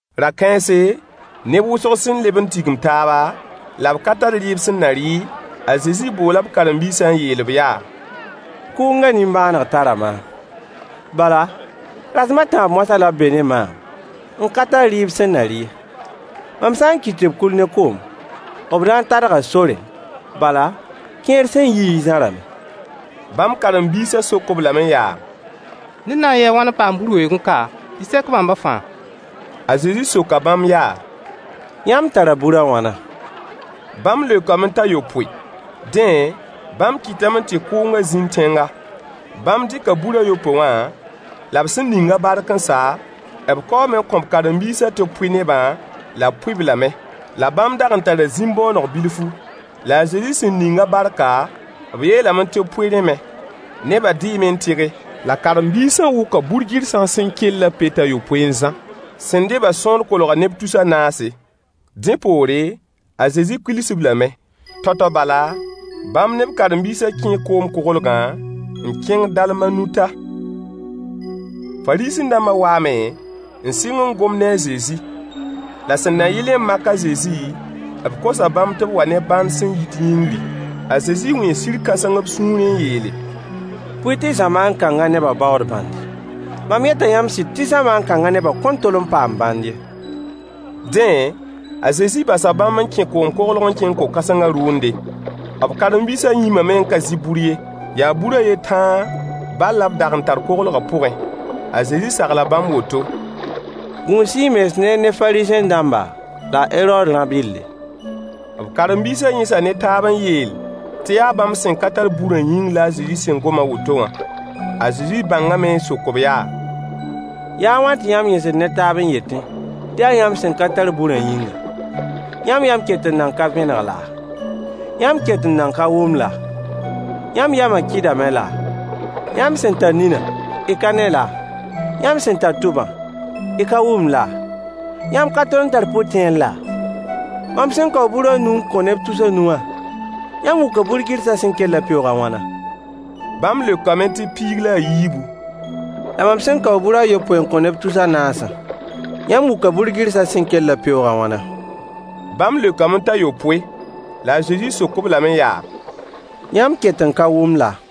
Ra-kãense, neb wʋsg sẽn leb n tigim taaba, la b ka tar rɩɩb sẽn na rɩ, a Zezi boola b karen-biisã n yeel-b yaa: Kʋʋngã nimbãaneg tara maam, bala, rasem a tãab moasã la b be ne maam n ka tar rɩɩb sẽn na rɩ ye. Mam sã n kɩt tɩ b kuil ne kom, b na n tadga sorẽ, bala, kẽer sẽn yiẽ zãrame. Bãmb karen-biisã sok-b lame yaa: Ned na n yɩɩ a wãn n paam bur weoogẽ ka tɩ sek bãmba fãa? A Zezi soka bãmb yaa: Yãmb tara bur a wãna? Bãmb leokame t'a yopoe. Dẽ, bãmb kɩtame tɩ kʋʋngã zĩnd tẽnga. Bãmb dɩka bur a yopoe wã, la b sẽn ning-a bark n sa, b kaoome n kõ b karen-biisã tɩ b pʋɩ nebã, la b pʋɩ-b lame. La bãmb dag n tara zĩm-bõoneg bilfu. La a Zezi sẽn ning-a barka, b yeelame tɩ b pʋɩ rẽ me. Nebã dɩɩme n tɩge. La karen-biisã wʋka bur-gɩrsã sẽn kellã peoog a yopoe n zã. Sẽn dɩ-bã sõor kolga neb tus a naase. Dẽ poore, a Zezi kuils-b lame. Tao-tao bala, bãmb ne b karen-biisã kẽe koom-koglgã n kẽng Dalmanuta. Fariisẽ-dãmba waame n sɩng n gom ne a Zezi. La sẽn na yɩlẽ n mak a Zezi, b kosa bãmb tɩ b wa ne bãnd sẽn yit yĩngri. A Zezi wẽe sir-kãseng b sũurẽ n yeele: Bõe tɩ zamaan kãngã nebã baood bãnde? Mam yeta yãmb sɩd tɩ zamaan kãngã nebã kõn tol n paam bãnd ye. Dẽ, a Zezi basa bãmb n kẽ koom koglg n kẽng ko-kãsengã rʋʋnde. B karen-biisã yĩmame n ka zɩ bur ye. Yaa bur a yen tãa bal la b dag n tar koglgã pʋgẽ. A Zezi sagla bãmb woto: Gũus-y y mens neer ne Fariisẽ-dãmba la Herood rã-bɩlle. B karen-biisã yẽsa ne taab n yeel tɩ yaa bãmb sẽn ka tar burã yĩng la a Zezi gom a woto wã. A Zezi bãngame n sok-b yaa: Yaa a wãn tɩ yãmb yẽsd ne taab n yetẽ tɩ yaa yãmb sẽn ka tar burã yĩnga? Yãmb yam ket n nan ka vẽneg laa? Yãmb ket n nan ka wʋm laa? Yãmb yamã kɩdame laa? Yãmb sẽn tar ninã y ka ne laa? “Yãmb sẽn tar tʋbã y ka wʋmd laa? Yãmb ka tol n tar pʋ-tẽer laa?” Mam sẽn kao bur a nu n kõ neb tus a nu wã, yãmb wʋka bur-gɩrsã sẽn kellã peoog a wãna? Bãmb leokame tɩ piig la a yiibu. La mam sẽn kao bur a yopoe n kõ neb tus a naasã, yãmb wʋka bur-gɩrsã sẽn kellã peoog a wãna? Bãmb leokame t'a yopoe. La a Zezi sok-b lame yaa: Yãmb ket n ka wʋm laa?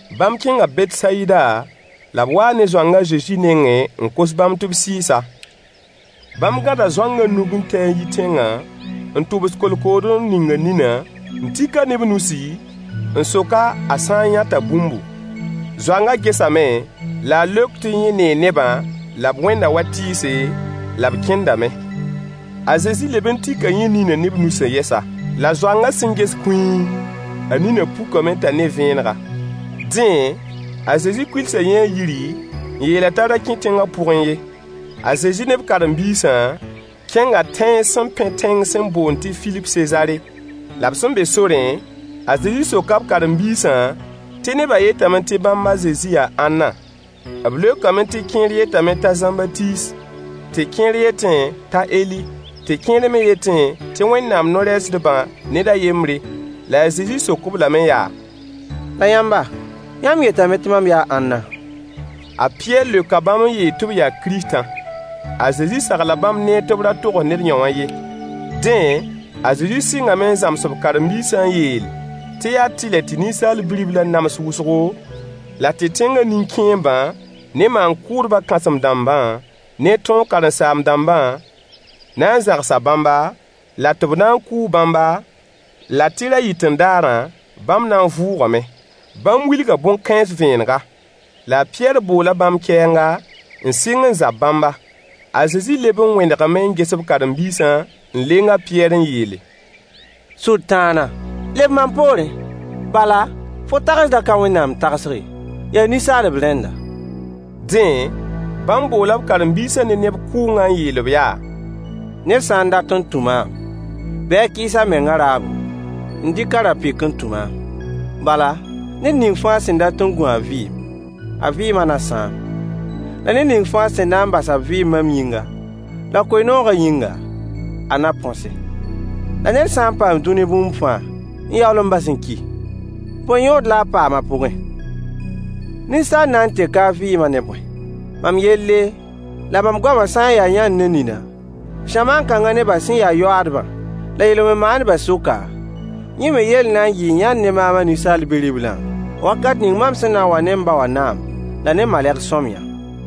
Bãmb kẽnga Betsayida, la b waa ne zoang a Zezi nengẽ n kos bãmb tɩ b sɩɩs-a. Bãmb gãda zoangã nug n tɛ-a n yi tẽngã, n tʋbs kolkood n ning a ninã, n tik-a ne b nusi, n sok-a a sã n yãta bũmbu. Zoangã gesame la a leok tɩ yẽ nee nebã, la b wẽnda wa tɩɩse, la b kẽndame. A Zezi leb n tika yẽ ninã ne b nusã yɛsa. La zoangã sẽn ges kũii, a ninã pukame t'a ne vẽenega. Dẽ, a Zezi kuilsa yẽ a yiri, n yeel-a t'a da kẽ tẽngã pʋgẽ ye. A Zezi ne b karen-biisã kẽnga tẽns sẽn pẽ tẽng sẽn boond tɩ Filip Sezaare. La b sẽn be sorẽ, a Zezi soka b karen-biisã tɩ nebã yetame tɩ bãmb a Zezi yaa ãnna? B leokame tɩ kẽer yetame t'a Zãmbatiis, tɩ kẽer yetẽ t'a Eli, tɩ kẽer me yetẽ tɩ Wẽnnaam no-rɛɛsdbã ned a yembre. La a Zezi sok-b lame yaa: La yãmba, yãmb yetame tɩ mam yaa ãnna? A Pɩyɛɛr leoka bãmb n yeel tɩ b yaa Kiristã. A Zezi sagla bãmb neer tɩ b ra togs ned yõwã ye. Dẽ, a Zezi sɩngame n zãms b karen-biisã n yeel tɩ yaa tɩlɛ tɩ Ninsaal Bi-riblã nams wʋsgo, la tɩ tẽngã nin-kẽembã ne maan-kʋʋdbã kãsem-dãmbã, ne tõog karen-saam-dãmbã na n zãgsa bãmba, la tɩ b na n kʋʋ bãmba, la tɩ ra-yɩt-n-daarã, bãmb na n vʋʋgame. Bãmb wilga bõn-kãens vẽenega. La a Pɩyɛɛr boola bãmb kɛɛnga, n sɩng n zab bãmba. A Zezi leb n wẽnegame n ges b karen-biisã, n leng a Pɩyɛɛr n yeele: Sʋtãana, leb mam poorẽ, bala, fo tagsgã ka Wẽnnaam tagsg ye, yaa ninsaalb rẽnda. Dẽ, bãmb boola b karen-biisã ne neb kʋʋngã n yeel-b yaa: Ned sã n dat n tũ maam, bɩ a kɩɩs a mengã raabo, n dɩk a ra-pɩk n tũ maam. Bala, ned ning fãa sẽn dat n gũ a vɩɩm, a vɩɩmã na sãam, la ned ning fãa sẽn na bas a vɩɩm mam yĩnga la koe-noogã yĩnga, a na põse. La ned sã n paam dũni bũmb fãa n yaool n bas n ki, bõe yõod la a paam a pʋgẽ? Ninsaal na n teka a vɩɩmã ne bõe? Mam yelle la mam goamã sã n ya yãnd ne nina zamaan kãngã nebã sẽn ya yoaadbã la yel-wẽn maandbã sʋka, yẽ me yell na n yɩɩ yãnd ne maam a Ninsaal Bi-riblã, wakat ning mam sẽn na n wa ne m ba wã naam la ne maleg-sõmyã.